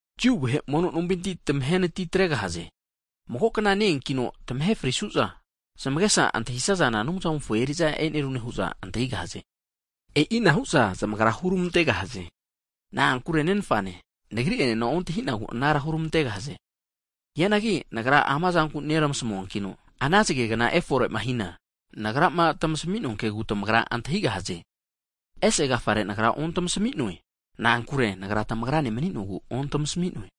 Jiu vahe mono nompinti (sinagog) tamahenati atregahaze. Mago kna ne-eankino, tamahe frisu'za zamagesa antahisazana Anumzamofo eri'za e'nerune hu'za antahigahaze. E'ina hu'za zamagra hurmantegahaze, na'ankure Nenfane Nagri enena ontahi'nagu anara hurmantegahaze. Hianagi ama zanku Nagra nermasmuankino, ana zagegna (aua) efore'ma hina, Nagrama tamasmi'noa kegu tamagra antahigahaze. Ese agafare Nagra ontamasami'noe, na'ankure Nagra tamagrane mani'nogu ontamasmi'noe.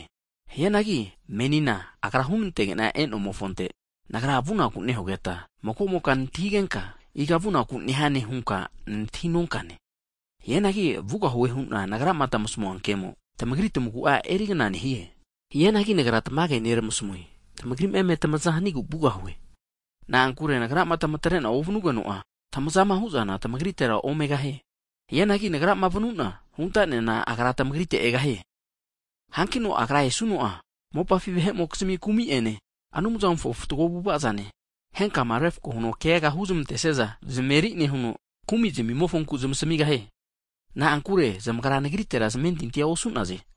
Hianagi menina Agra hunantege'na e'nomofonte, Nagra vunaku nehugeta mago'moka nantahigenka, iga vunaku nehane? hunka nantahi nonkane. Hianagi vugahue hu'na Nagrama tamasmua kemo, tamagri tamagu'a erigna nehie. Hianagi Nagra tamage neramasmue, tamagrima eme tamaza hanigu vugahue, na'ankure Nagrama tamatre'na ovanugeno'a, tamaza hu'zana tamagritera omegahie. Hianagi Nagrama vanuna, huntanena, Agra tamagritega egahie. Hankino Agra esuno'a, mopafi vahe'mokizmi kumi'ene, Anumzamofo fatgo avu'ava zane, henkama refko huno keaga huzmantesiaza zameri nehuno, kumi zamimofonku zamasmigahie. Na'ankure zamagra Nagritera zamentintia osu'naze.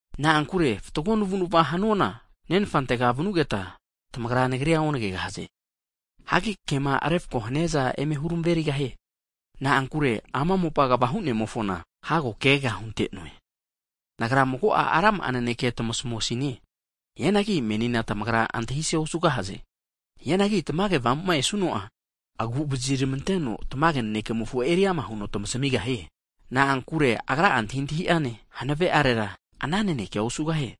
Na'ankure fatgo navu'navama hanuana, Nenfantega vanugeta, tamagra Nagrira onagegahaze. Hagi kema refko haniaza eme huramerigahie. Na'ankure ama mopa kva hu'nemofona hago keaga hunte'noe. Nagra mago'a rama'a naneke tamasmusine, hianagi menina tamagra antahise osugahaze. Hianagi Tamage Avamu'ma esuno'a, antahi antahimofona eri ama hina tamage nanekea keta antahita hugahaze. Na'ankure Agra'a antahintahi'ane, hanave'arera ana nanekea osugahie,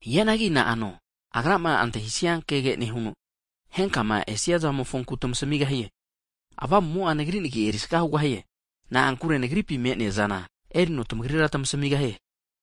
hianagi na'ano Agrama antahisia kege nehuno, henkama esia zamofonku tamasmigahie. Avamumo'a, Nagri nagi erisaga hugahie, na'ankure Nagripi me'neazana erino tamagrira tamasmigahie.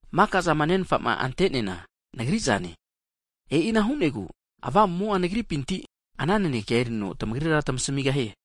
Maka'zama Nenfa'ma ante'neana Nagri'zane hu'na hu'noe, e'ina hu'negu Avamumo'a Nagripinti ana nanekea erino tamagrira tamasmigahie.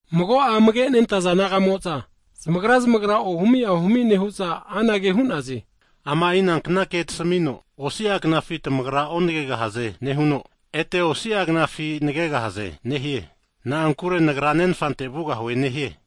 Mago'a amage' nentaza disaipol naga'mo'za zamagra zamagra ohumi ahumi nehu'za anage hu'naze, Ama'i nankna naneke tasmino, osi'a knafi tamagra onagegahaze nehuno, ete osi'a knafi nagegahaze nehie. Na'ankure Nagra Nenfante vugahue nehie?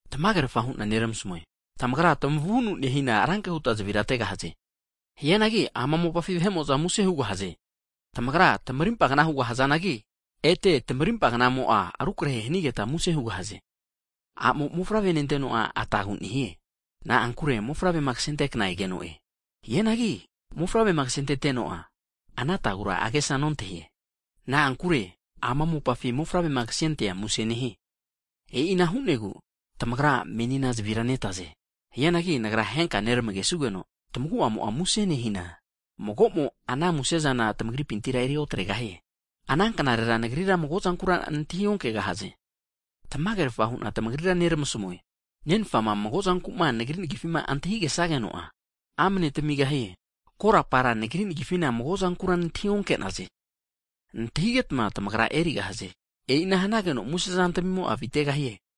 Tamagerfa hu'na neramasmue. Tamagra tamavunu nehina ranke huta zavira ategahaze, hianagi ama mopafi vahe'mo'za muse hugahaze. Tamagra tamarimpa kna hugahazanagi ete tmarimpa knamo'a eri rukrahe hanigeta, muse hugahaze. A'mo mofavrema nenteno'a atagu nehie, na'ankure mofavrema kasente kna egeno'e, hianagi mofavrema ksentete'no'a, ana atagura agesa nontahie. Na'ankure ama mopafi mofavrema kasentea muse nehie. E'i ana hu'negu tamagra menina zavira netaze, hianagi Nagra henka nermagesugeno, tamagu'amo muse nehina, mago'mo ana musezana tamagripintira eri otregahie. Ana knarera Nagrira mago'zankura nantahi onkegahaze. Tamagerafa hu'na tamagrira neramasmue, Nenfama mago zanku'ma Nagri nagifima antahigesageno'a, amne tamigahie. Korapara Nagri nagifina mago'zankura antahi onke'naze. Hianagi tamagra antahigetma erigahaze, e'ina hanageno muse zantmimo'a avitegahie.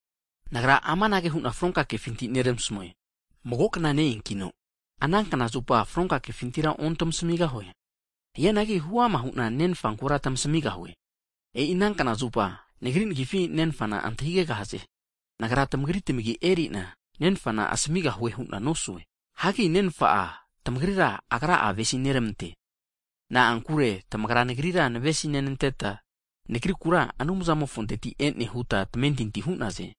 Nagra amanage hu'na fronka kefinti neramasmue, mago kna ne-eanki'na, ana kna zupa fronka kefintira ontamasmigahue. Hianagi huama hu'na Nenfankura tmasmigahue. E'i ana knazupa, Nagri nagifi Nenfana antahigegahaze. Nagra tamagri tamagi eri'na, Nenfana asmigahue hu'na nosue. Hagi Nenfa'a tamagrira Agra'a avesineramante, na'ankure tamagra Nagrira tamavesinenteta Nagrikura Anumzamofonteti e'ne huta tamentinti hu'naze.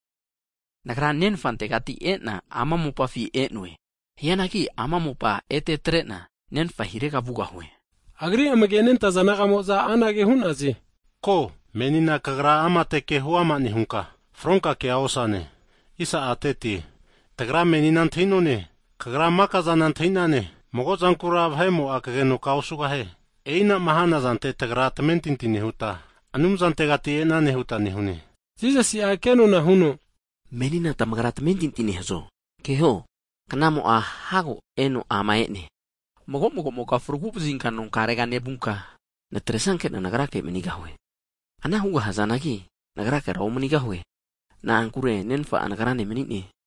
Nagra Nenfantegati e'na, ama mopafina e'noe, hianagi ama mopa ete atre'na Nenfa hirega vugahue. Hige'za Agri amage' nentaza disaipol naga'mo'za anage hu'naze, Ko menina Kagra amate ke huama nehunka, fronka kea osane. Tagra menina antahi'none, Kagra maka'zana antahi'nane, mago zankura vahe'mo'a kagenoka osugahie. E'ina'ma hanazante tagra tamentinti nehuta, Anumzantegati e'nane huta nehune. Jisasi'a kenona huno, Menina tamagra tamentinti nehazo? Keho, knamo'a (aua) hago eno ama e'ne, mago mago'moka nonkarega nevunka, natresanke'na Nagrake manigahue, ana hugahazanagi Nagrakera omanigahue. Na'ankure Nenfa'a Nagrane mani'ne.